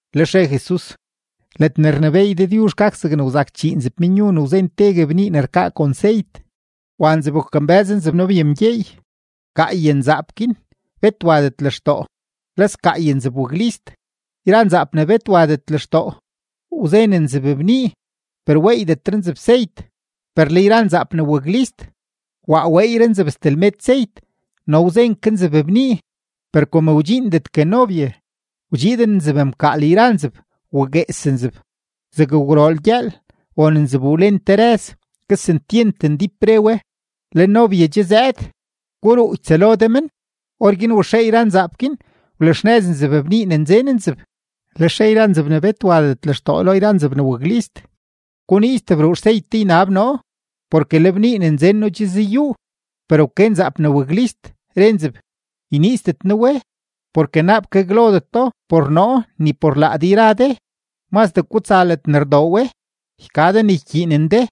Lex re Jesus: ―Ledne rnebééy Dëdyuzh gak zegne wzak chii nzebmenyu ne wzen tegue bnii ne rkaa kon seyt; wa nzeb wakambë́z nzeb nobyemgyeey. Gaay nzaap guin bet wadet lextoo, le sgaay nzeb waklist. Yra nzaap ne bet wadet lextoo, wzen nzeb bnii, per weeydetre nzeb seyt; per le yra nzaap ne waklist, waa weeyre nzeb steblmet seyt no wzen ke nzeb bnii. Per kom wdxiindetgue nobye, wdxiiden nzeb mkaal yra nzeb, waguees nzeb. Zeg gwrool gyëël won nzeb wlen te rëz, kesentyent ndíp re we: “¡Le nobye che zëëd; guruu ytsëlo de men!” Orguin waxee yra nzaap guin, wlaxnëz nzeb bnii ne nzen nzeb. Lex re yra nzeb ne bet wadet lextoo lo yra nzeb ne waklist: “Guniiz tebruu xseyt de ynab noo, porke le bnii ne nzen noo che zayuu.” Per wke yra nzeb ne waklist, re nzeb: “Yniizdet noo we, porke naap gaglodeto por noo ni por laa de yra de. Mazdee gutsa ledne rdoo we, yka de ne ykyiinen de.”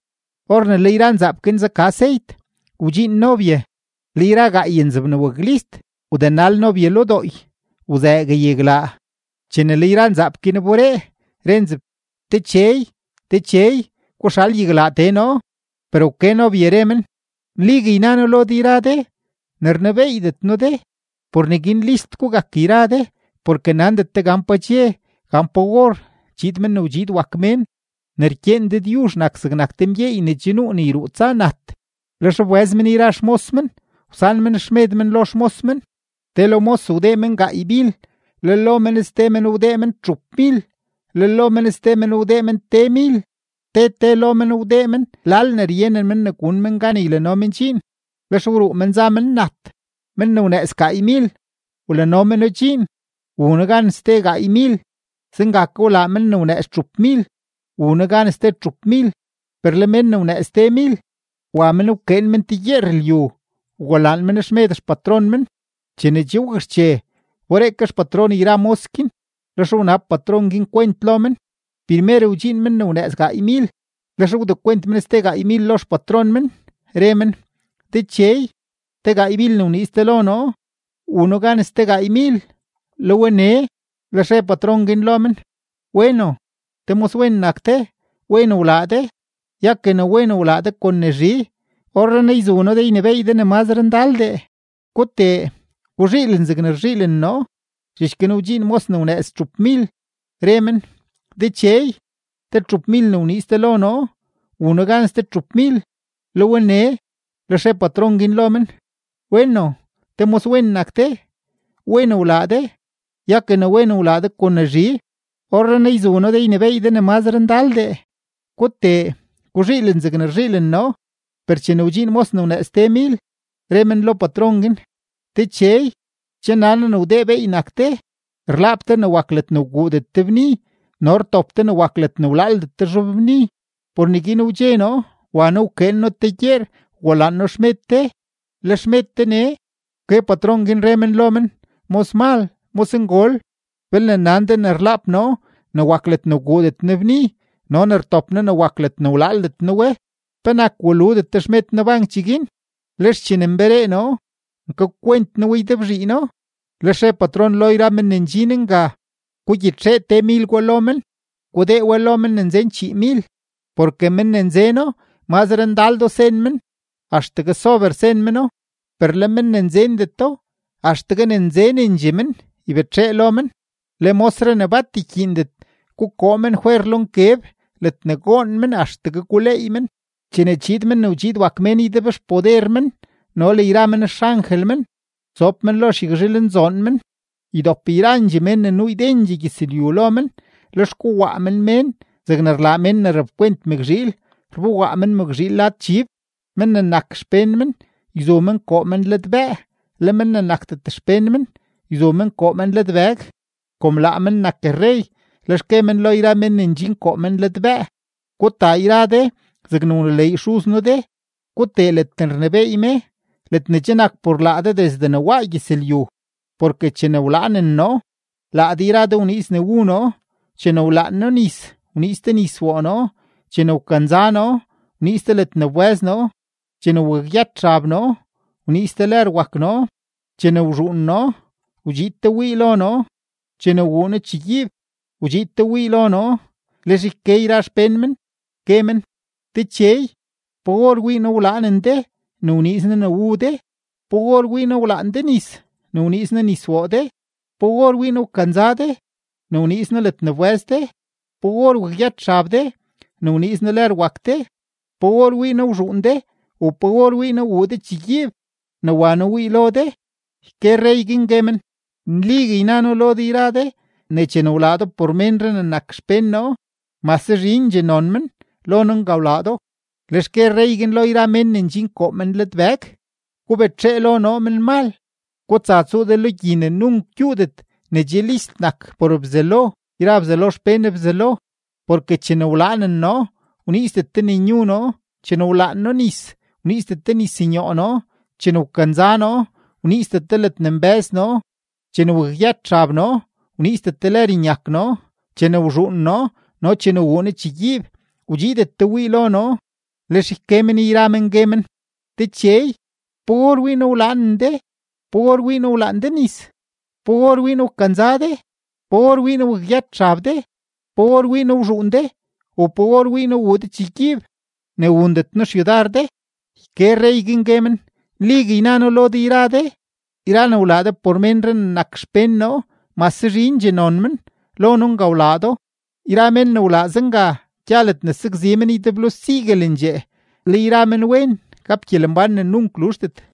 Or ne le yra nzaap guin zaka seyt, wdxiin nobye; le yra gaay nzaap ne waklist wdenal nobye lo dooy, wzëëgue yaglaa. Chene le yra nzaap guin wberee, re nzeb: “¡Dechey, dechey, guxal yaglaa tee noo!” Per wke nobye, re men: “Nligue yna noo lo de yra de, ne rnebeeydet noo de.” ’Por neguin list gugak yra de porke nandet de gan pa dxe, gan pa or chiid Men ne wdxiid wak Mén. ’Ne rkyeen Dëdyuzh nak zegnak te mgyeey ne che nuu ne yruu tsa nat; lex wbëz men yra xmos men, wsan men xmed men lo xmos men. ’Te lo mos wdee men gaaymil, le lo men ste men wdee men txupmil, le lo men ste men wdee men temil, te te lo men wdee men lal ne ryenen men ne gun men gan ylano men dxiin. Lex wruu men za men nat. Men ne wnëëz gaaymil wlano meno dxiin, wuno gan ste gaaymil. Zenga ke wlaa men ne wnëëz txupmil, wuno gan ste txupmil. Per le men ne wnëëz temil, wa men wkeen men te gyeer lyu, wgulaan men xmed xpatron men. ’Chene che wakxche, wberee ke xpatron yra mos guin, lex wnab patron guin kwent lo men. Primer wdxiin men ne wnëëz gaaymil, lex wdekwent men ste gaaymil lo xpatron men, re men: “Dechey, te gaaymil ne wniiz de lo noo, wun noo gan ste gaaymil, le we nee.” Lex re patron guin lo men: “Weno, te moswen nak de, wen wlaa de; ya ke ne wen wlaa de kon ne zhi, orrenaa yzu noo de ynebééy de ne mazre ndaldee. Gutee, guzhiilen zegne rzhiilen noo.” Zhich guin wdxiin mos ne wnëëz txupmil, re men: “Dechey, te txupmil ne wniiz de lo noo, wun noo gan ste txupmil, le we nee.” Lex re patron guin lo men: “Weno, te moswen nak de, wen wlaa de; ya ke ne wen wlaa de kon ne zhi, orrenaa yzu noo de ynebééy de ne mazre ndaldee. Gutee, guzhiilen zegne rzhiilen noo.” Per chene wdxiin mos ne wnëëz temil, re men lo patron guin: “Dechey, che nan noo ne wdee beey nak de, rlaap de ne wak ledne wguudet de bni no rtop de ne wak ledne wlaaldet de zhobbni. Por neguin wdxe noo, wa noo wkyeen noo te gyeer wgulaan noo xmed de; le xmed de nee.” Wke patron, re men lo men: “Mosmal, mosngol, belne nan de ne rlaap noo ne wak ledne wguudet noo bni no ne rtop noo ne wak ledne walaaldet noo we, ¿penak waludet de xmed noo bank cheguin? Lex chene nberee noo, nkakwent noo we ydebzhiino.” Lex re patron lo yra men ne ndxin nga: “Gugyitxee temil gwa lo men, gudee we lo men ne nzen chiimil. Porke mén ne nzeno, mazre ndaldoo sen men, axtegue sober sen meno; per le mén ne nzendeto, axtegue ne nzenendxee men ybetxee lo men. Le mosree ne bat ykyiindet, gukoo men fwer lo nkeb ledne goon men axtegue guleey men.” ’Chene chiid Men ne wdxiid wak Mén ydebxpoder men no le yra men xangel men, sob men lo xyagzhilnzoon men. Ydop yrandxee mén ne nuu ydendxee gyëzlyu lo men; lex kowaa men mén zegne rlaa men ne rapkwent mëkzhiil, rbowaa men mëkzhiil lad chib. Men ne nak xpén men, yzu men koo men ladbëë; le men ne nakdet xpén men, yzu men koo men ladbëg. Kom laa men nak rrey, lex gue men lo yra mén ne ndxin koo men ladbëë: “Gutaa yra de zegne wneleey Dëdyuzh Xuz noo de; gutee ledne rnebééy me ledne che nak por laa de desde ne waa gyëzlyu. Porke chene wlaanen noo, laa de yra de wniiz ne wu noo; chene wlaan noo nis, wniiz de nis woo noo; chene wkanza noo, wniiz de ledne wbë́z noo; chene wakyët xab noo, wniiz de lër wak noo; chene wzhuun noo, wdxiid de wii lo noo; chene wuu noo chegyiib, wdxiid de wii lo noo.” Lex yke yra xpén men, gue men: “Dechey, ¿pa or wii noo wlaanen de ne wniiz noo ne wu de? ¿Pa or wii noo wlaan de nis ne wniiz noo nis woo de? ¿Pa or wii noo wkanza de ne wniiz noo ledne wbë́z de? ¿Pa or wakyët xab de ne wniiz noo lër wak de? ¿Pa or wii noo wzhuun de u pa or wii noo wuu de chegyiib ne wa noo wii lo de?” Yke rrey guin, gue men: “Nligue yna noo lo de yra de ne chene wlaa do por te ménree ne nak xpén noo, mase zhindxee non men, lo noo nga wlaa do.” ’Lex gue rrey guin lo yra mén ne ndxin koo men ladbëg: “Gubetxee lo noo, menmal; gutsa tsuu de lo gyi ne nunk gyuudet ne che list nak por Bzelo yra Bzelo xpén Bzelo. Porke chene wlaanen noo, wniizdet de ne nyu noo; chene wlaan noo nis, wniizdet de nis nyoo noo; chene wkanza noo, wniizdet de ledne nbë́z noo; chene wakyët xab noo, wniizdet de lër nyak noo; chene wzhuun noo no chene wuu noo chegyiib, wdxiidet de wii lo noo.” Lex yke men yra men, gue men: “Dechey, ¿pa or wii noo wlaanen de? ¿Pa or wii noo wlaan de nis? ¿Pa or wii noo wkanza de? ¿Pa or wii noo wakyët xab de? ¿Pa or wii noo wzhuun de, u pa or wii noo wuu de chegyiib, ne wundet noo xyudar de?” Yke rrey guin, gue men: “Nligue yna noo lo de yra de, yra ne wlaadet de por te ménree ne nak xpén noo, mase zhindxee non men, lo noo nga wlaadet do.” Yra men ne wlaa zenga gya ledne sakzi men ydeblo siguelendxee, le yra menwen gap gyelembán ne nunk luzhdet.